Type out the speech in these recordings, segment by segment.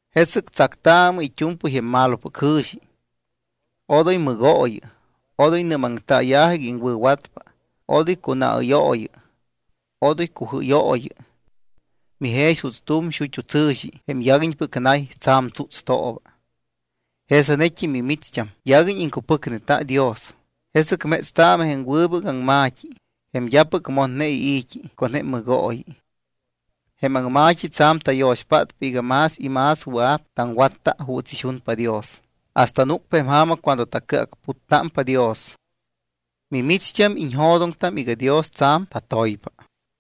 Jesɨc tsactaamɨ it́u̱mpɨy jém malopɨc jɨ̱xi. Odoy mɨgooyɨ, odoy nɨ́maŋtaaya̱jɨ iga iŋwɨ̱watpa, odoy cunaɨ́yooyɨ, odoy cujɨ́yooyɨ. Mijex juuts tu̱m xut́u tsɨ̱xi jém yaguiñpɨc nay, tsa̱m tsútstooba. Jesanet́im mimicht́am yaguiñ iŋcupɨcneta Dios, jesɨc métstaamɨ jém wɨbɨc aŋma̱t́i, jém d́apɨc motne ii̱t́i con jém mɨgooyi. Jém aŋma̱t́i tsa̱m tayo̱xpátpa iga más y más wɨa̱p taŋwatta juuts ixunpa Dios hasta núcpa jém ja̱ma cuando tacɨacputtámpa Dios. Mimicht́am iñjo̱doŋtam iga Dios tsa̱m tatoypa.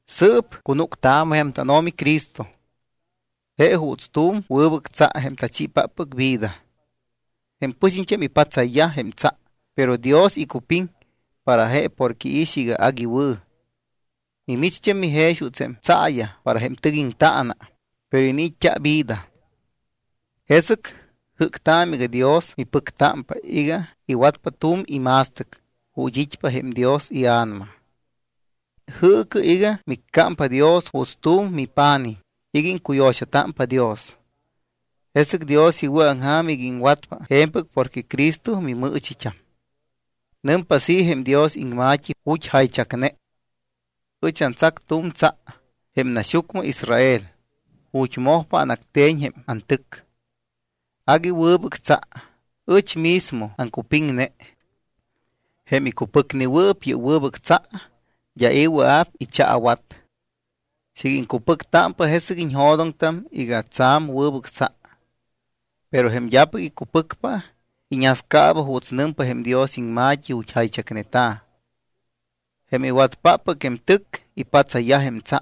Sɨɨp cunúctaamɨ jém tánO̱mi Cristo. Je juuts tu̱m wɨbɨc tsa jém tachiipáppɨc vida. Jém pɨxiñt́am ipatsayyaj jém tsa, pero Dios icupiŋ para je porque iix iga agui wɨ̱. Mimicht́am mijex juuts jém tsaayaj para jém tɨc iŋtaana, pero iniit́t́a vida. Jesɨc jɨ́ctaamɨ iga Dios mipɨctámpa iga iwatpa tu̱m ima̱stɨc ju̱t́ it́pa jém Dios iA̱nama. Jɨɨcɨ iga miccámpa Dios juuts tu̱m mipa̱nij iga iŋcuyo̱xatámpa Dios. Jesɨc Dios iwɨ̱aŋja̱m iga iŋwatpa je̱mpɨc porque Cristo mimɨɨchit́am. Nɨmpa así jém Dios iŋma̱t́i ju̱t́ jaychacne: Ɨch antsac tu̱m tsa jém naxyucmɨ Israel ju̱t́ mojpa anacte̱ñ jém antɨc. Agui wɨbɨc tsa, ɨch mismo aŋcupiŋne. Jém icupɨcnewɨɨp yɨ́p wɨbɨc tsa, d́a i̱ wɨa̱p ichaawat. Siiga iŋcupɨctámpa, jesɨc iñjo̱doŋtam iga tsa̱m wɨbɨc tsa. Pero jém d́apɨc icupɨcpa, iñascaaba juuts nɨmpa jém Dios iŋma̱t́i ju̱t́ jaychacneta̱: Jém iwatyajpáppɨc jém tɨc ipatsayyaj jém tsa.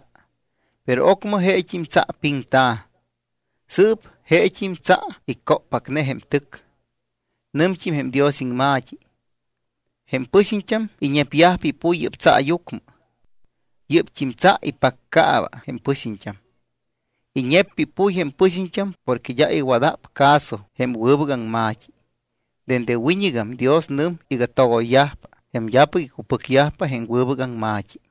Pero ocmɨ jeet́im tsa piŋta̱. Sɨɨp jeet́im tsa icóppacne jém tɨc. Nɨmt́im jém Dios iŋma̱t́i: Jém pɨxiñt́am iñepyajpa ipuy yɨ́p tsaayucmɨ. Yɨ́pt́im tsa ipaccaaba jém pɨxiñt́am. Iñeppa ipuy jém pɨxiñt́am porque d́a iwada̱p caso jém wɨbɨc aŋma̱t́i. Dende wiñɨgam Dios nɨm iga togoyyajpa jém d́apɨc icupɨcyajpa jém wɨbɨc aŋma̱t́i.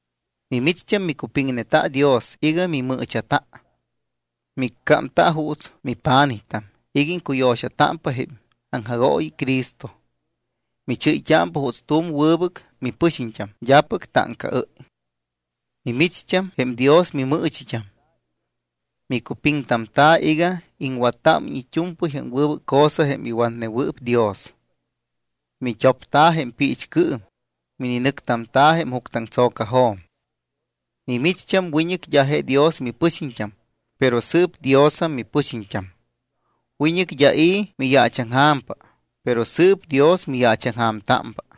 Mimicht́am micupiŋneta Dios iga mimɨɨcha̱ta. Miccámta juuts mipa̱nijtam iga iŋcuyo̱xatámpa jém aŋjagooyi Cristo. Michɨ́yt́ámpa juuts tu̱m wɨbɨc mipɨxiñt́am d́apɨc táŋcaɨ́y. Mimicht́am jém Dios mimɨɨchit́am. Micupiŋtamta̱ iga iŋwattámiñ it́u̱mpɨy jém wɨbɨc cosa jém iwatnewɨɨp Dios. Mit́opta jém piichcɨɨm, mininɨctamta̱ jém juctɨaŋtso̱cajo̱m. Mimicht́am wiñɨc d́a je Dios mipɨxiñt́am, pero sɨɨp Diosam mipɨxiñt́am. Wiñɨc d́a i̱ miyaachaŋja̱mpa, pero sɨɨp Dios miyaachaŋja̱mtámpa.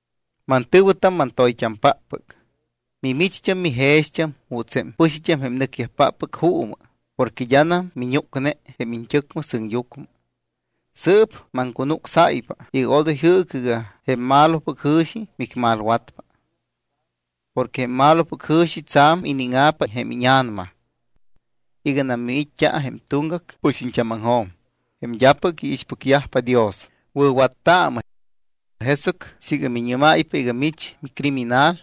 Mantɨ̱wɨtam mantoyt́ampáppɨc, mimicht́am mijext́am juuts jém pɨxiñt́am jém nɨcpáppɨc juumɨ porque d́anam miñúcne jém iñt́ɨcmɨ sɨŋyucmɨ. Sɨɨp maŋcunucsáypa iga odoy jɨɨcɨ iga jém malopɨc jɨ̱xi micmalwatpa. Porque jém malopɨc jɨ̱xi tsa̱m iníŋa̱pa jém íña̱nama. Iganam miit́t́a jém tuŋgac pɨxiñt́ámaŋjo̱m, jém d́apɨc iixpɨcyajpa Dios, wɨ̱wattaamɨ. Jesɨc siiga miñɨ́máypa iga mich micriminal,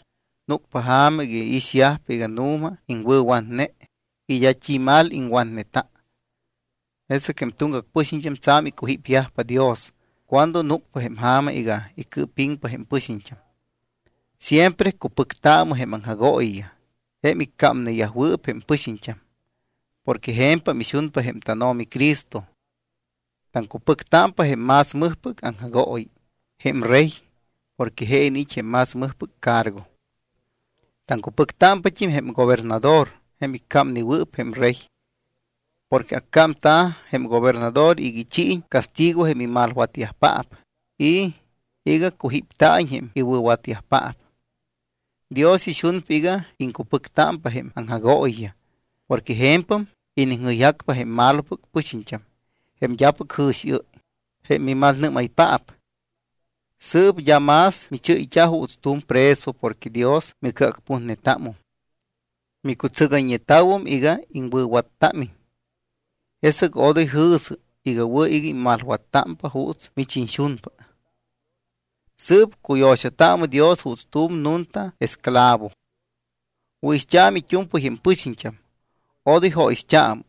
núcpa ja̱ma iga iixyajpa iga nu̱ma iŋwɨ̱watne y d́a t́i mal iŋwatneta. Jesɨc jém tuŋgac pɨxiñt́am tsa̱m icujípyajpa Dios cuando núcpa jém ja̱ma iga icɨɨpiŋpa jém pɨxiñt́am. Siempre cupɨctaamɨ jém aŋjagooyiyaj, jém iccámneyajwɨɨp jém pɨxiñt́am, porque je̱mpam ixunpa jém tánO̱mi Cristo. Taŋcupɨctámpa jém más mɨjpɨc aŋjagooyi, jém rey, porque je iniit́ jém más mɨjpɨc cargo. Taŋcupɨctámpat́im jém gobernador jém iccámnewɨɨp jém rey. Porque accámta̱ jém gobernador iga ichiiñ castigo jém imalwatyajpaap y iga cujípta̱iñ jém iwɨ̱watyajpaap. Dios ixunpa iga iŋcupɨctámpa jém aŋjagooyiyaj porque je̱mpam iniŋjɨyjacpa jém malopɨc pɨxiñt́am, jém d́apɨc jɨ̱xiɨ́y, jém mimalnɨ́maypaap. Sɨɨp d́a más michɨ́yt́a juuts tu̱m preso porque Dios micɨacputnetámum. Micutsɨgayñeta̱wum iga iŋwɨ̱wattámiñ. Jesɨc odoy jɨ̱sɨ iga wɨ̱ iga immalwattámpa juuts mich iñxunpa. Sɨɨp cuyo̱xataamɨ Dios juuts tu̱m nunta esclavo. Wɨ̱ixt́aamɨ it́u̱mpɨy jém pɨxiñt́am, odoy jóyixt́aamɨ.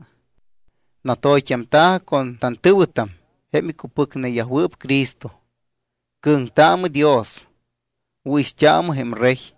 Natoyt́amta̱jɨ con tantɨ̱wɨtam jém icupɨcneyajwɨɨp Cristo. Cɨ̱ŋtaamɨ Dios. Wɨ̱ixt́aamɨ jém rey.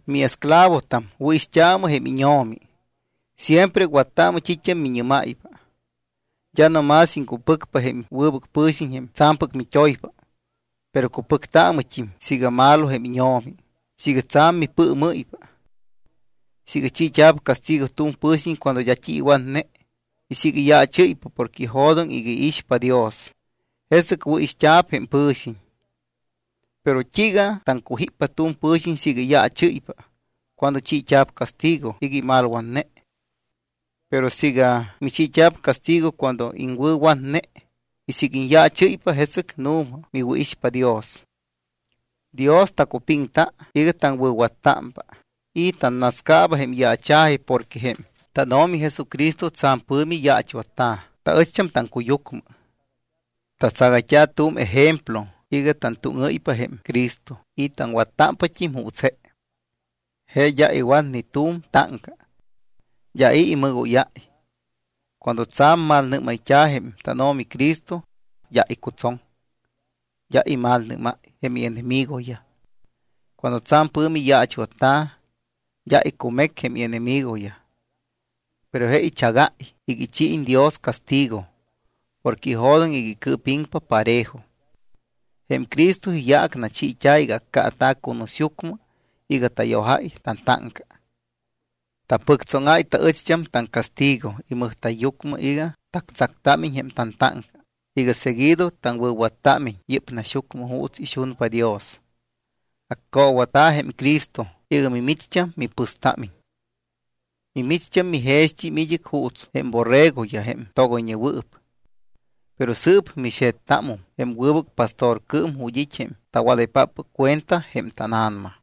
Miesclavotam, wɨ̱ixt́aamɨ jém íño̱mi. Siempre wattaamɨ t́it́am miñɨ́máypa. D́a no más iŋcupɨcpa jém wɨbɨc pɨ̱xiñ jém tsa̱mpɨc mit́oypa, pero cupɨctaamɨt́im siiga malo jém íño̱mi siiga tsa̱m mipɨɨmɨ́ypa. Siiga chiit́a̱p castigo tu̱m pɨ̱xiñ cuando d́a t́i iwatne y siiga iyaachɨ́ypa porque ijo̱doŋ iga iixpa Dios, jesɨc wɨ̱ixt́a̱p jém pɨ̱xiñ. ¿Pero t́iiga taŋcujíppa tu̱m pɨ̱xiñ siiga iyaachɨ́ypa cuando chiit́a̱p castigo iga imalwatne? Pero siiga michiit́a̱p castigo cuando iŋwɨ̱watne y siiga iñyaachɨ́ypa, jesɨc nu̱ma miwɨ̱ixpa Dios. Dios tacupiŋta iga taŋwɨ̱wattámpa y tannascaaba jém yaacha̱ji porque jém tánO̱mi Jesucristo tsa̱m pɨ̱mi yaachwatta̱ taɨcht́am taŋcuyucmɨ. Tatsagayt́a tu̱m ejemplo iga tantúŋɨ́ypa jém Cristo y taŋwattámpat́im juuts je. Je d́a iwat ni tu̱m táŋca. D́a i̱ imɨgóyáy. Cuando tsa̱m malnɨ́mayt́a̱ jém tánO̱mi Cristo, d́a icutsoŋ, d́a imalnɨ́máy jém ienemigoyaj. Cuando tsa̱m pɨ̱mi yaachwatta̱, d́a icumec jém ienemigoyaj. Pero je ichagáy iga ichiiñ Dios castigo porque ijo̱doŋ iga icɨɨpiŋpa parejo. Jém Cristo iyaac nachiit́a̱ iga accaata̱ cunusyucmɨ iga tayojáy tantáŋca. Tapɨctsóŋáy taɨcht́am taŋcastigo imɨjta̱yyucmɨ iga tactsactámiñ jém tantáŋca, iga seguido taŋwɨ̱wattámiñ yɨ́p naxyucmɨ juuts ixunpa Dios. Accoowata̱ jém Cristo iga mimicht́am mipɨstámiñ. Mimicht́am mijext́im id́ɨc juuts jém borregoyaj jém togoyñewɨɨp. Pero sɨɨp mixe̱ttámum jém wɨbɨc pastorcɨɨm ju̱t́ it́ jém tawadaypáppɨc cuenta jém tána̱nama.